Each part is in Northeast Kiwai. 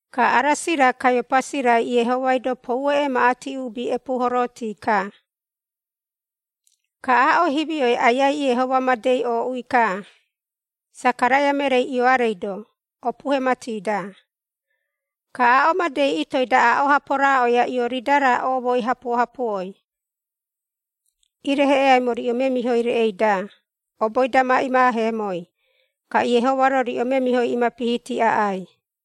Ka Arasi-ra Kaiopasi-rai, Iehomai-do poue emaꞌati uubi epuuhoroti-ka. Ka aaꞌo himioi Aiai Iehoma madei ooꞌui-ka, Sakaraia mereei Ioarei-do, opuhe mati-da. Ka aaꞌo madei itooi-da aaꞌo-ha poroaꞌoia Ioridara oomoi hapuo-hapuoi, “Ireheꞌeaimo riꞌo memihoi reꞌei-da oboi-da ma imaaheemoi, ka Iehoma-ro riꞌo memihoi imapihiti aꞌai.”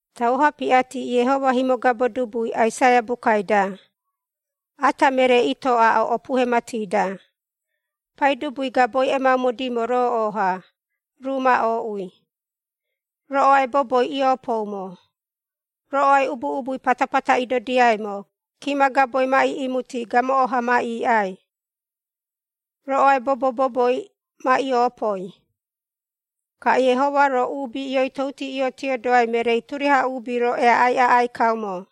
Tauo-ha piꞌati, Iehoma himogabo dubui Aisaia bukai-da, “Ata meree itoo aaꞌo opuhe mati-da, ‘Paidubui gaboi emaumodimo rooꞌo-ha, ruu ma ooꞌui. Roꞌoai boboi iiopoumo, roꞌoai ubu-ubui patapata idodiaimo, Kima gaboi ma iꞌimuti, gamoꞌo-ha ma iiꞌai, roꞌoai bobo-boboi ma imoopoi. Ka Iehoma-ro, uubi ioitouti iotiodoai mereei, turiaha uubi-ro eaꞌai aꞌai kaumo.’”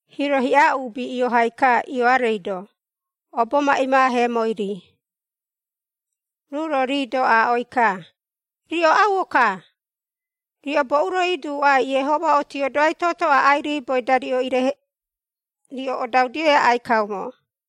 Hiiro hiꞌa uubi iohai-ka, Ioarei-do, obo ma imaaheemoi-ri, ruu-ro rii-do aaꞌoi-ka, “Riꞌo auo-ka! Riꞌo boꞌu-ro imoaduꞌo Iehoma otiodoai toto aꞌai riiboi-da riꞌo odaudioi aꞌai kaumo?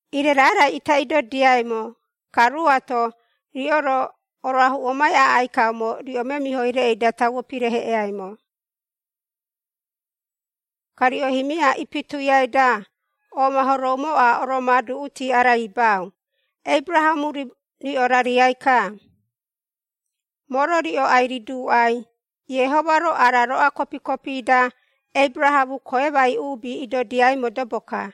Ire raarai ita idodiaimo, ka ruuato riꞌo-ro oroahuꞌomai aꞌai kaumo riꞌo memihoi-da tauo pireheꞌeaimo. Ka riꞌo himia ipituiai-da omahoroumoꞌa oromoaduꞌuti araibau, ‘Aberahamo riꞌo rariai-ka.’ Moo-ro riꞌo ai-riduuꞌai Iehoma-ro ara roꞌoa kopi-kopi-da Aberahamo koemai uubi idodiai modobo-ka!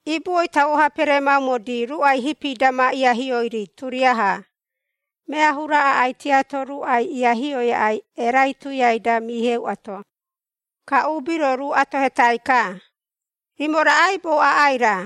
Ibuoi tauo-ha peremaumodi, ruꞌai hipi-da ma iahioi-ri turiaha, mea hura aꞌai tiato ruꞌai iahioi aꞌai erai tuiai-da miheuꞌato.” Ka uubi-ro ruu atohetai-ka, “Rimo raꞌaibou aꞌai-ra?”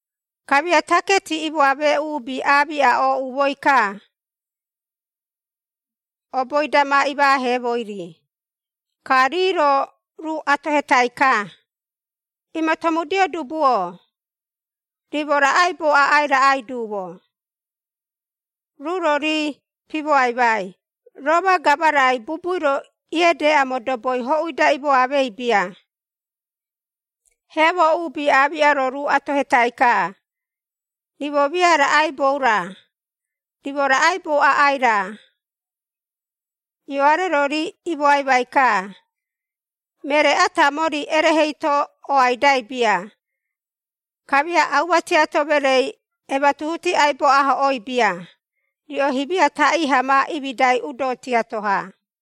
Kamia taketi imoamee uubi aamiꞌa, ooꞌumoi-ka, oboi-da ma imaaheemoi-ri, ka rii-ro ruu atohetai-ka, “Imatomudio dubu-o, rimo raꞌaibou aꞌai raꞌai duumo?” Ruu-ro rii pimoaimai, “Roma gamarai bubui-ro iedeꞌa modoboi ohui-da imoamei bia.” Heamo uubi aamiꞌa-ro ruu atohetai-ka, “Rimo mia raꞌaibou-ra? Rimo raꞌaibou aꞌai-ra?” Ioare-ro rii imoaimai-ka, “Meree ata mori, erehe eito oaidai bia, kamia auma tiato mereei, ematuhuti aibo ahoꞌoi bia. Riꞌo himia taꞌii-ha ma imidai udo tiato-ha.”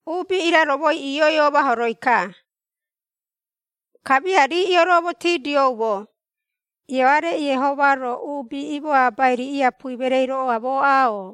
Uubi iraromoi, iioi omahoroi-ka, kamia rii ioroomotidioumo, Ioare Iehoma-ro, uubi imoabai-ri iapui mereei roꞌoamooꞌa-o?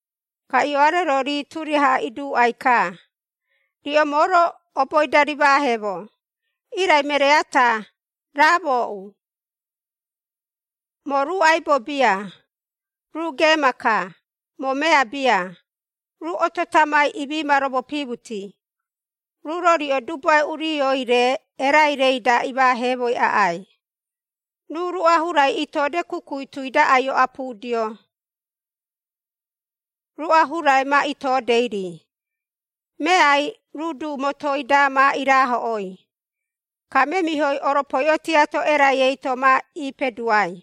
Ka Ioare-ro rii turiaha iduuꞌai-ka, “Riꞌo moo-ro oboi-da rimaaheemo, irai meree ata raa mooꞌu. Moo ruu aibo bia, ruu geema-ka, moo mea bia ruu oto tamai imi ma romopimuti, ruu-ro riꞌo Dubuae Urioi-re, erai-reida, imaaheemoi aꞌai. Ruu ruꞌa hurai itode kukui tui-da ai-oꞌapudio, ruꞌa hurai ma itodei-ri, meai ruu du motoi-da, ma iraahoꞌoi, ka memihoi oropoiꞌo tiato erai eito ma ipeduai.”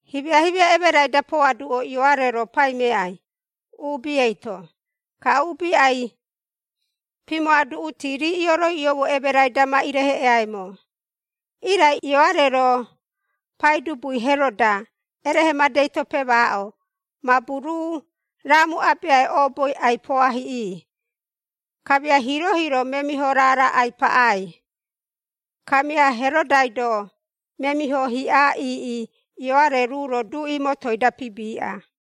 Himia-himia emerai-da poaduꞌo, Ioare-ro paimeai, uubi eito, ka uubi ai-pimoaduꞌuti, rii ioroiꞌioumo emerai-da ma ireheꞌeaimo. Irai Ioare-ro pai dubui Heroda erehe madei-to pemaaꞌo, mabu ruu raamu-abeai, ooboi Herodia ai-poahiꞌi, kamia hiiro-hiiro memiho raara ai-paꞌai. Kamia Herodai-do memiho hiꞌa iiꞌi, Ioare ruu-ro duꞌi motoi-da pibiꞌa.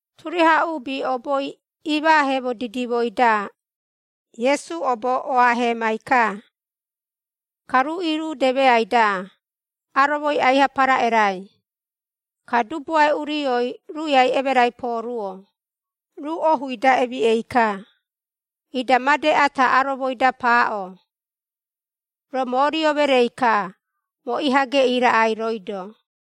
Turiaha uubi oboi imaaheemo didimoi-da, Iesu obo oaahemai-ka. Ka ruu iirudemeai-da, aromoi aiha paraꞌerai. Ka Dubuae Urioi, ruiai emerai pooruo, ruu ohui-da emiꞌei-ka. Ida made ata aromoi-da paaꞌo, “Roo moo rio mereei-ka, moo iha geꞌii raꞌai rooi-do.”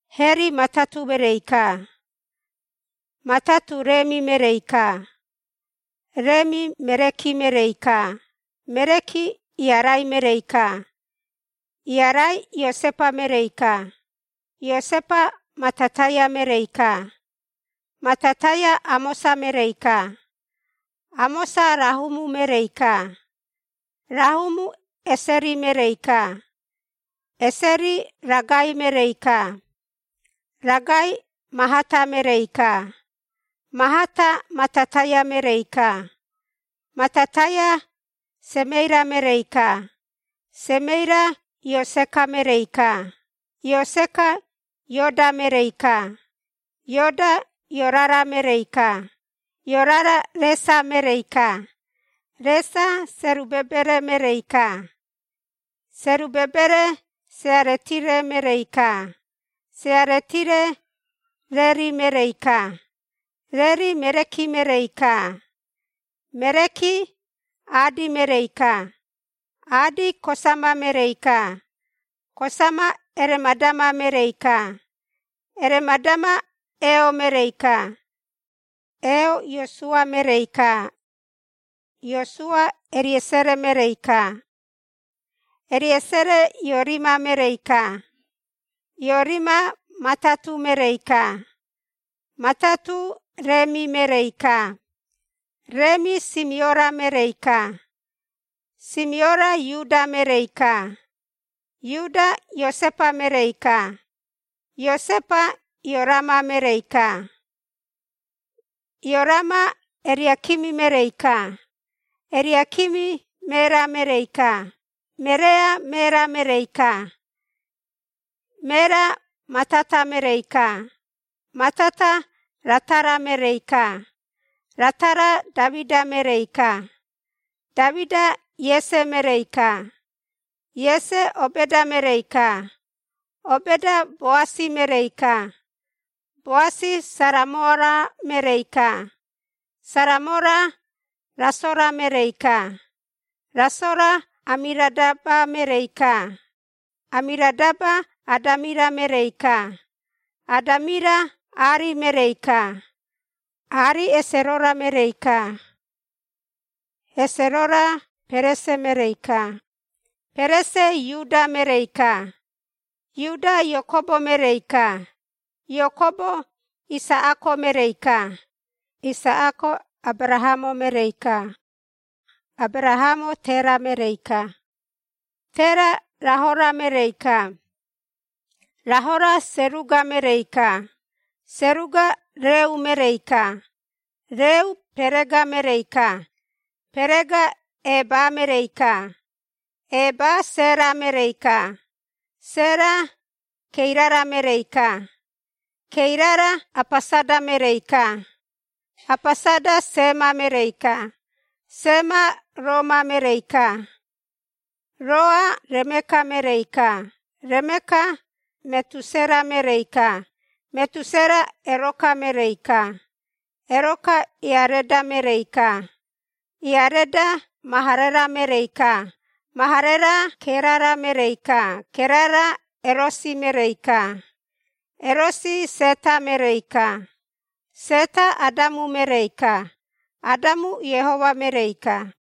Heri Matatu mereei-ka, Matatu Remi mereei-ka, Remi Mereki mereei-ka, Mereki Iarai mereei-ka, Iarai Iosepa mereei-ka, Iosepa Matataia mereei-ka, Matataia Amosa mereei-ka, Amosa Rahumu mereei-ka, Rahumu Eseri mereei-ka, Eseri Ragai mereei-ka, Ragai Mahata mereei-ka, Mahata Matataia mereei-ka, Matataia Semeira mereei-ka, Semeira Ioseka mereei-ka, Ioseka Ioda mereei-ka, Ioda Iorara mereei-ka, Iorara Resa mereei-ka, Resa Serubabere mereei-ka, Serubabere Searetiere mereei-ka, Searetiere Reri mereei-ka, Reri Mereki mereei-ka, Mereki Adi mereei-ka, Adi Kosama mereei-ka, Kosama Eramadama mereei-ka, Eramadama Eo mereei-ka, Eo Iosua mereei-ka, Iosua Eriesere mereei-ka, Eriesere Iorima mereei-ka, Iorima Matatu mereei-ka, Matatu Remi mereei-ka, Remi Simiora mereei-ka, Simiora Iuda mereei-ka, Iuda Iosepa mereei-ka, Iosepa Iorama mereei-ka, Iorama Eriakimi mereei-ka, Eriakimi Merea mereei-ka, Merea Mera mereei-ka, Mera Matata mereei-ka, Matata Ratara mereei-ka, Ratara Damida mereei-ka, Damida Iese mereei-ka, Iese Obeda mereei-ka, Obeda Boasi mereei-ka, Boasi Saramora mereei-ka, Saramora Rasora mereei-ka, Rasora Amiradaba mereei-ka, Amiradaba Adamira mereei-ka, Adamira Ari mereei-ka, Ari Hesarora mereei-ka, Hesarora Perese mereei-ka, Perese Iuda mereei-ka, Iuda Iakobo mereei-ka, Iakobo Isaꞌako mereei-ka, Isaꞌako Aberahamo mereei-ka, Aberahamo Tera mereei-ka, Tera Rahora mereei-ka, Rahora Seruga mereei-ka, Seruga Reu mereei-ka, Reu Perega mereei-ka, Perega Eba mereei-ka, Eba Sera mereei-ka, Sera Keirara mereei-ka, Keirara Apasada mereei-ka, Apasada Sema mereei-ka, Sema Roa mereei-ka, Roa Remeka mereei-ka, Remeka Metusera mereei-ka, Metusera Eroka mereei-ka, Eroka Iareda mereei-ka, Iareda Maharera mereei-ka, Maharera Kerara mereei-ka, Kerara Erosi mereei-ka, Erosi Seta mereei-ka, Seta Adamu mereei-ka, Adamu Iehoma mereei-ka.